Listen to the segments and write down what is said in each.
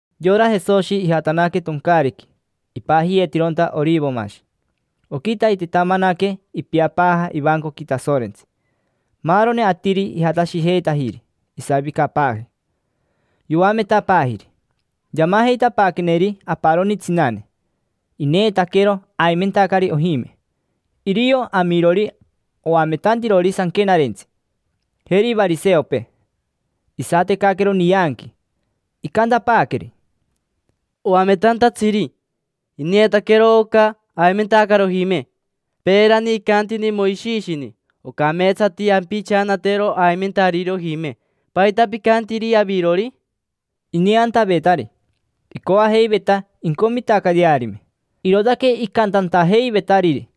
Yora Jesoshi ijatanaque toncaariqui, ipajiyeetironta Orivomashi. Oquitaitetamanaque ipiapaaja ivancoqui Tasorentsi. Maaroni atiri ijatashijeitajiri. Isavicapaaji, yoametapaajiri. Yamajeitapaaqueneri aparoni tsinane, ineetaquero aimentacari ojime. Irio amirori oametantirori Sanquenarentsi, jeri variseopee. Isatecaquero nianqui, icantapaaqueri: —Oametantatsiri, ineetaquero oca aimentacari ojime. Peerani icantini Moishishini ocameetsati ampichanatero aimentariri ojime. ¿Paita picantiri avirori? Ineantavetari, icoajeiveta incomitacayearime, irootaque icantantajeivetariri.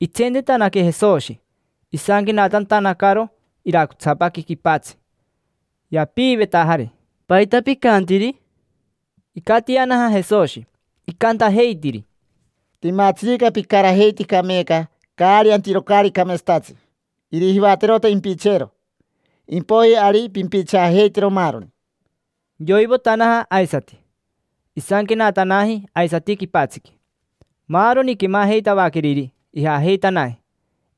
Itsentetanaque Jesoshi, isanquenatantanacaro iracotsapaqui quipatsi. Yapiivetajari: —¿Paita picantiri? Icatianaja Jesoshi. Icantajeitiri: —Timatsirica picarajeitica meeca caari antiro caari cameetsatatsi, irijivaterota impicheero; impoiji ari pimpichaajeitero maaroni. Yoivotanaja aisati. Isanquenatanaji aisati quipatsiqui. Maaroni quemajeitavaqueriri, ijajeitanaji.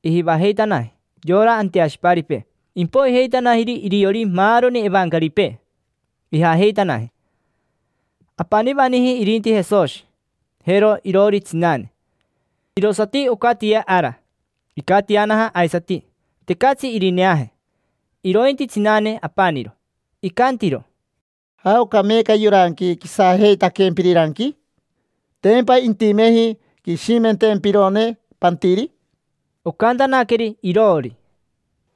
Ijivajeitanaji yora anteashiparipee, impoijeitanajiri iriori maaroni evancaripee, ijajeitanaji. Apanivaniji irinti Jesoshi, jero iroori tsinane. Irosati ocatia ara. Icatianaja aisati. Tecatsi irineaje, irointi tsinane apaniro. Icantiro: —¿Jaoca meeca yoranqui quisajeitaquempiriranqui? ¿Tempa intimeji quishimentempirone pantiri? Ocantanaqueri iroori: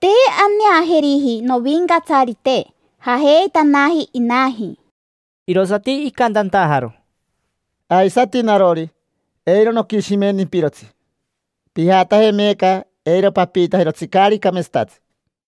—Te aneajeriji, novincatsarite, jajeitanaji inaji. Irosati icantantajaro: —Aisati narori, eiro noquishimentimpirotsi. Pijataje meeca, eiro papiitajirotsi caari cameetsatatsi.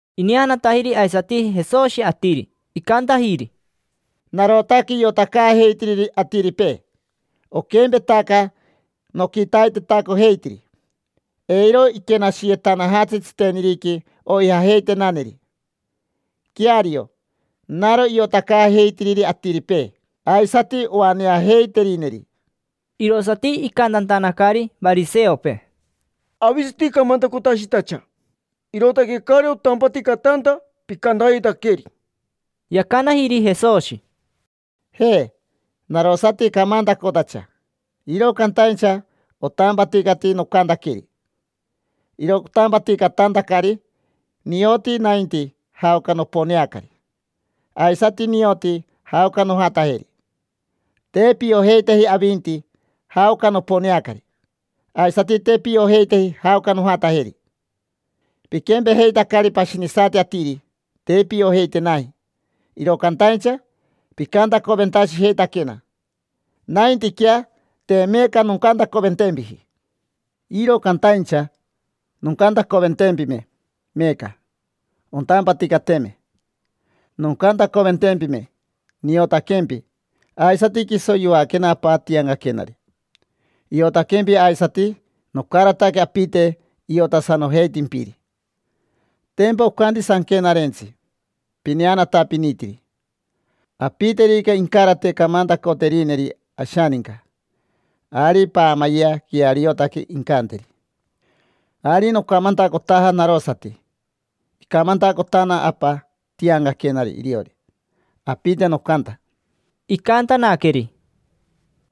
Ineanatajiri aisati Jesoshi atiri, icantajiri: —Narotaque iotacaajeitiriri atiripee, oquempetaca noquitaitetacojeitiri. Eiro iquenashiyetanajatsi tsiteniriqui oijajeitenaneri. Queario, naro iotacaajeitiriri atiripee, aisati oaneajeiterineri. Irosati icantantanacari variseopee: —Avisati camantacotashitacha. Irootaque caari otampaticatanta picantayetaqueri. Yacanajiri Jesoshi: —Je, narosati camantacotacha, iro cantaincha otampaticati nocantaqueri. Iro otampaticatantacari nioti nainti jaoca noponeacari. Aisati nioti jaoca nojatajeri. Te piojeiteji avinti jaoca noponeacari, aisati te piojeiteji jaoca nojatajeri. Piquempejeitacari pashinisati atiri: te piojeitenaji, iro cantaincha picantacoventashijeitaquena. Naintiquea, te meeca noncantacoventempiji. Iro cantaincha, noncantacoventempime meeca, ontampaticateme noncantacoventempime. Niotaquempi; aisati quiso yoaquena Apa tiancaquenari, iotaquempi aisati. Nocarataque apite iotasanojeitimpiri. Tempa ocanti Sanquenarentsi pineanatapinitiri: “Apiterica incarate camantacoterineri ashaninca, ari paamayea queariotaque incanteri”. Ari nocamantacotaja narosati, icamantacotana Apa tiancaquenari iriori; apite nocanta. Icantanaqueri: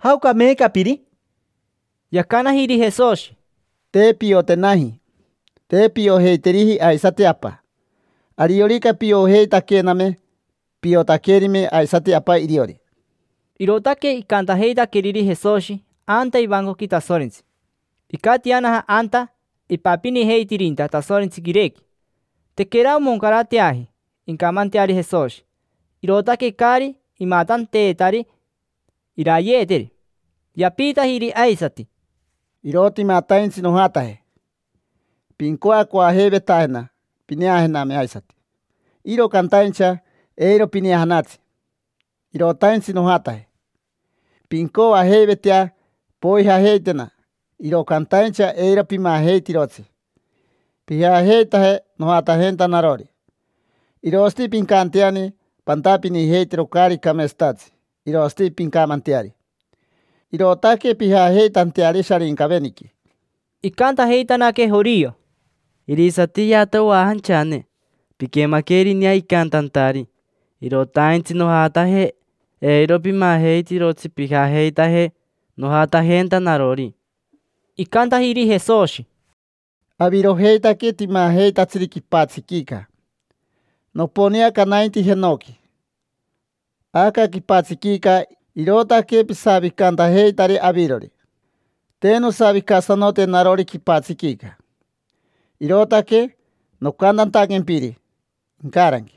—¿Jaoca meeca piri? Yacanajiri Jesoshi: —Te piotenaji. Te piojeiteriji aisati Apa. Ariorica piojeitaquename piotaquerime aisati Apa iriori. Irootaque icantajeitaqueriri Jesoshi anta ivancoqui Tasorentsi. Icatianaja anta ipapinijeitirinta Tasorentsi quirequi. Tequera omoncarateaji incamanteari Jesoshi, irootaque caari imatanteetari irayeeteri. Yapiitajiri aisati: —Irotimataintsi nojataje. Pincoacoajeivetajena pineajename aisati, iro cantaincha eiro pineajanatsi. Irotaintsi nojataje. Pincoajeivetea poijajeitena, iro cantaincha eiro pimajeitirotsi pijajeitaje nojatajenta narori. Irosati pincanteani pantapinijeitero caari cameetsatatsi irosati pincamanteari, irootaque pijajeitanteari Sharincaveniqui. Icantajeitanaque jorio: —Irisatiyeata oajanchane. Piquemaquerinea icantantari: “Irotaintsi nojataje, eiro pimajeitirotsi pijajeitaje nojatajenta narori”. Icantajiri Jesoshi: —Avirojeitaque timajeitatsiri quipatsiquica. Noponeaca nainti jenoqui. Aca quipatsiquica irootaque pisavicantajeitari avirori. Te nosavicasanote narori quipatsiquica. Irootaque nocantantaquempiri incaranqui: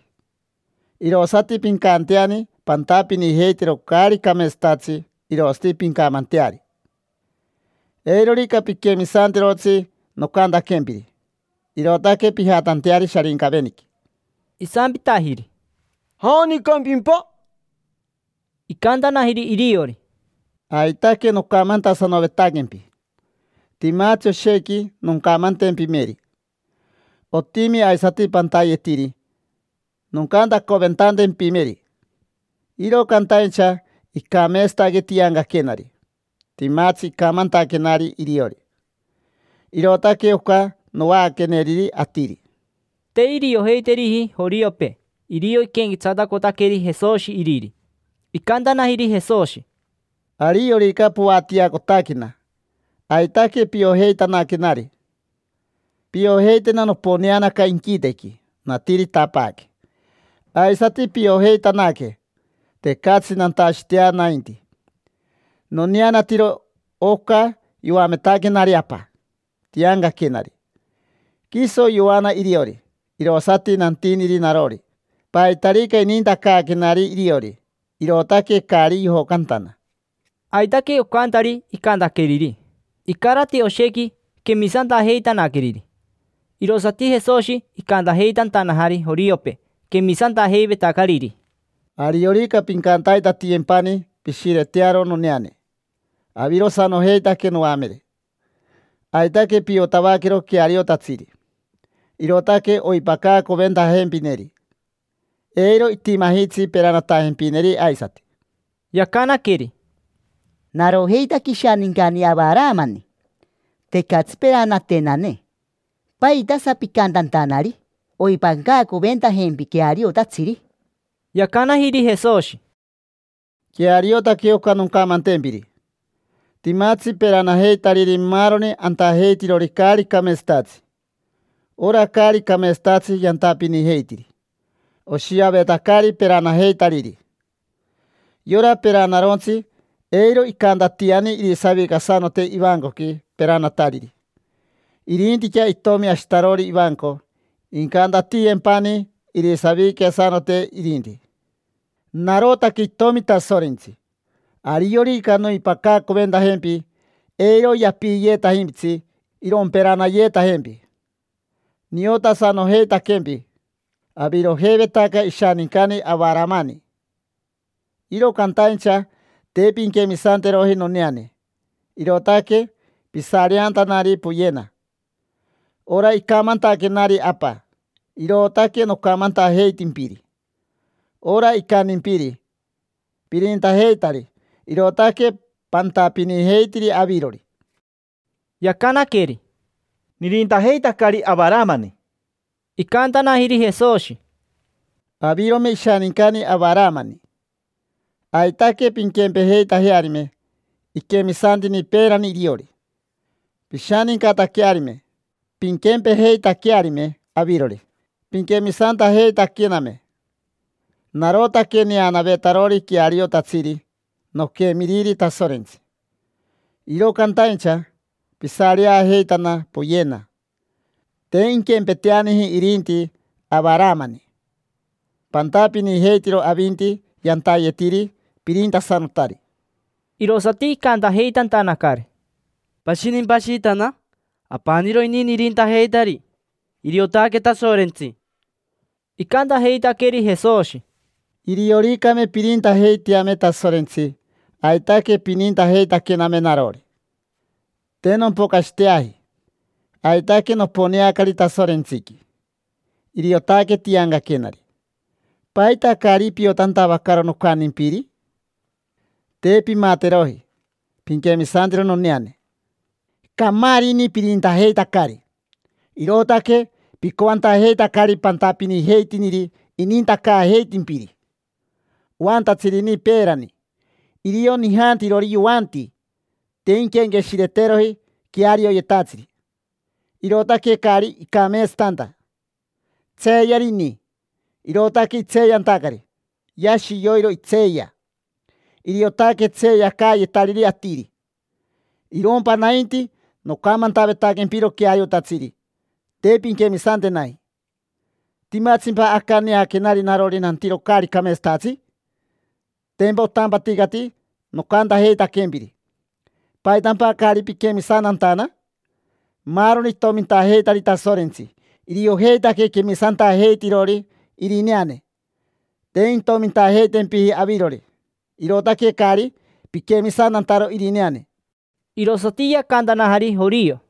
“Irosati pincanteani pantapinijeitero caari cameetsatatsi irosati pincamanteari”. Eirorica piquemisantirotsi nocantaquempiri, irootaque pijatanteari Sharincaveniqui. Isampitajiri: —¿Janicampimpa? Icantanajiri iriori: —Aitaque nocamantasanovetaquempi. Timatsi oshequi noncamantempimeri; otimi aisati pantayetiri noncantacoventantempimeri. Iro cantaincha icameetsataque tiancaquenari, timatsi icamantaquenari iriori: irootaque oca novaaqueneriri atiri. Te iriojeiteriji joriopee irio iquenquetsatacotaqueri Jesoshi Iriri. Icantanajiri Jesoshi: —Ariorica poatiacotaquena, aitaque piojeitanaquenari. Piojeitena noponeanaca inquitequi, natiritapaaque. Aisati piojeitanaque tecatsi nantashitea nainti. Noneanatiro oca yoametaquenari Apa tiancaquenari, quiso yoana iriori. Irosati nantiniri narori paitarica inintacaaquenari iriori, irootaque caari yojocantana. Aitaque ocantari icantaqueriri. Icarati oshequi quemisantajeitanaqueriri. Irosati Jesoshi icantajeitantanajari joriopee quemisantajeivetacariri: —Ariorica pincantaitatiyempani pishiretearo noneane, avirosanojeitaque noamere. Aitaque piotavaquero queariotatsiri. Irootaque oipacaacoventajempineri. Eiro itimajitsi peranatajempineri aisati. Yacanaqueri: —Narojeitaque ishanincani Avaramani. Tecatsi peranatenane. ¿Paitasa picantantanari: “Oimpacaacoventajempi queariotatsiri”? Yacanajiri Jesoshi: —Queariotaque oca noncamantempiri. Timatsi peranajeitariri maaroni antajeitirori caari cameetsatatsi. Ora caari cameetsatatsi yantapinijeitiri, oshiavetacari peranajeitariri. Yora peranarontsi eiro icantatiani irisavicasanote ivancoqui peranatariri. Irintiquea itomi ashitarori ivanco incantatiyempani irisavicasanote irinti. Narotaque itomi Tasorentsi. Ariorica noimpacaacoventajempi, eiro yapiiyeetajimpitsi iromperanayeetajempi. Niotasanojeitaquempi, avirojeivetaca ishanincani Avaramani. Iro cantaincha te pinquemisanteroji noneane. Irootaque pisareantanari poyena. Ora icamantaquenari Apa, irootaque nocamantajeitimpiri. Ora icantimpiri pirintajeitari irootaque pantapinijeitiri avirori. Yacanaqueri: —Nirintajeitacari Avaramani. Icantanajiri Jesoshi: —Avirome ishanincani Avaramani, aitaque pinquempejeitajearime. Iquemisantini peerani iriori; pishanincataquearime, pinquempejeitaquearime avirori, pinquemisantajeitaquename. Narotaque neanavetarori queariotatsiri noquemiriri Tasorentsi. Iro cantaincha pisareajeitana poyena. Te inquempeteaniji irinti Avaramani. Pantapinijeitiro avinti yantayetiri pirintasanotari. Irosati icantajeitantanacari: —¿Pashinimpa ashitana? Apaniro ini nirintajeitari. Iriotaque Tasorentsi. Icantajeitaqueri Jesoshi: —Irioricame pirintajeiteame Tasorentsi aitaque pinintajeitaquename narori. Te nompocashiteaji; aitaque noponeacari Tasorentsiqui, iriotaque tiancaquenari. ¿Paita caari piotantavacaro nocantimpiri? Te pimateroji pinquemisantero noneane. Camaari ini pirintajeitacari. Irootaque picoantajeitacari pantapinijeitiniri inintacaajeitimpiri. Oantatsiri ini peerani: irio nijantirori yoanti. Te inquenqueshireteroji quearioyetatsiri, irootaque caari icameetsatanta. Tseeyari ini, irootaque itseeyantacari. Yashi yoiro itseeya. Iriotaque tseeyacaayetariri atiri. Irompa nainti nocamantavetaquempiro queariotatsiri, te pinquemisantenaji. ¿Timatsimpa aca neaquenari narori nantiro caari cameetsatatsi? Tempa otampaticati nocantajeitaquempiri. ¿Paitampa caari piquemisantantana? Maaroni itomintajeitari Tasorentsi, iriojeitaque quemisantajeitirori irineane. Te intomintajeitempiji avirori. Irootaque caari piquemisantantaro irineane. Irosati yacantanajari jorio: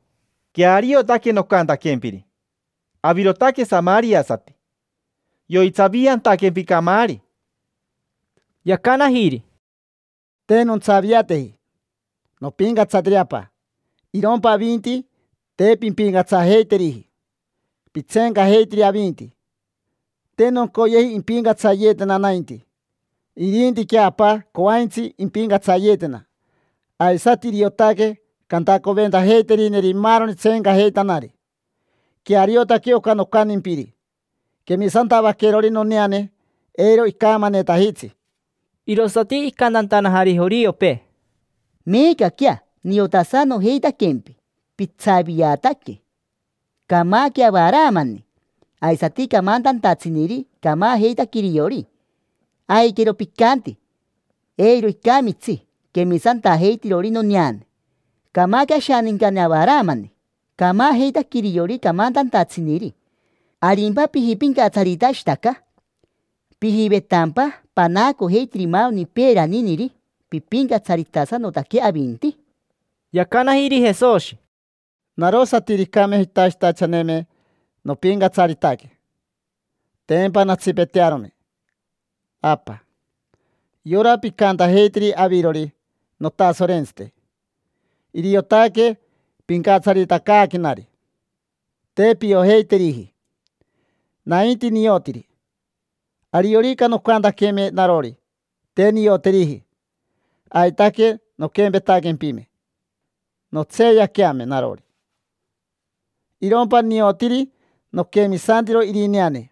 —Queariotaque nocantaquempiri. Avirotaque samariasati, yoitsaviantaquempi camaari. Yacanajiri: —Te nontsaviateji. Nopincatsatiri Apa. Irompa avinti te pimpicatsajeiteriji; pitseencajeitiri avinti. Te noncoyeji impincatsayeetena nainti. Irintiquea Apa coaintsi impincatsayeetena. Aisati iriotaque cantacoventajeiterineri maaroni tseencajeitanari. Queariotaque oca nocantimpiri. Quemisantavaquerori noneane eiro icamanetajitsi. Irosati icantantanajari joriopee: —Meecaquea niotasanojeitaquempi pitsaviataque. Camaque Avaramani. Aisati camantantatsiniri, camajeitaque iriori. Aiquero picanti: “Eiro icamitsi quemisantajeitirori noneane”. Camaque ashanincani Avaramani. Camajeitaque iriori camantantatsiniri. ¿Arimpa pijipincatsaritashitaca? ¿Pijivetampa panaacojeitiri maaroni peeraniniri pipincatsaritasanotaque avinti? Yacanajiri Jesoshi: —Narosatiricame jitashitachaneme nopincatsaritaque, tempa nantsipetearome. Apa, yora picantajeitiri avirori: “Notasorentsite”, iriotaque pincatsaritacaaquenari. Te piojeiteriji. Nainti niotiri. Ariorica noncantaqueme narori: “Te nioteriji”, aitaque nonquempetaquempime, nontseeyaqueame narori. Irompa niotiri. Noquemisantiro irineane.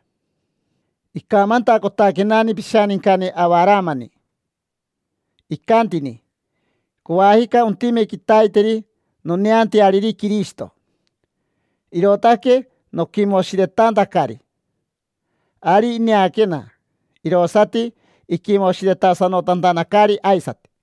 Icamantacotaquenani pishanincani Avaramani, icantini: “Coajica ontime quitaiteri noneanteariri Quirishito, irootaque noquimoshiretantacari”. Ari ineaquena, irosati iquimoshiretasanotantanacari aisati.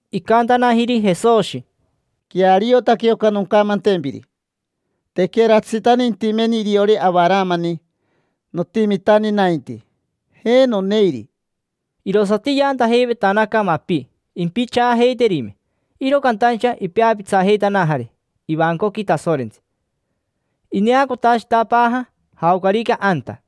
Icantanajiri Jesoshi: —Queariotaque oca noncamantempiri. Tequeratsitani intimeni iriori Avaramani, notimitani nainti. Je, noneiri. Irosati yaantajeivetanaca mapi, impichaajeiterime. Iro cantaincha ipeapitsajeitanajari ivancoqui Tasorentsi, ineacotashitapaaja jaocarica anta.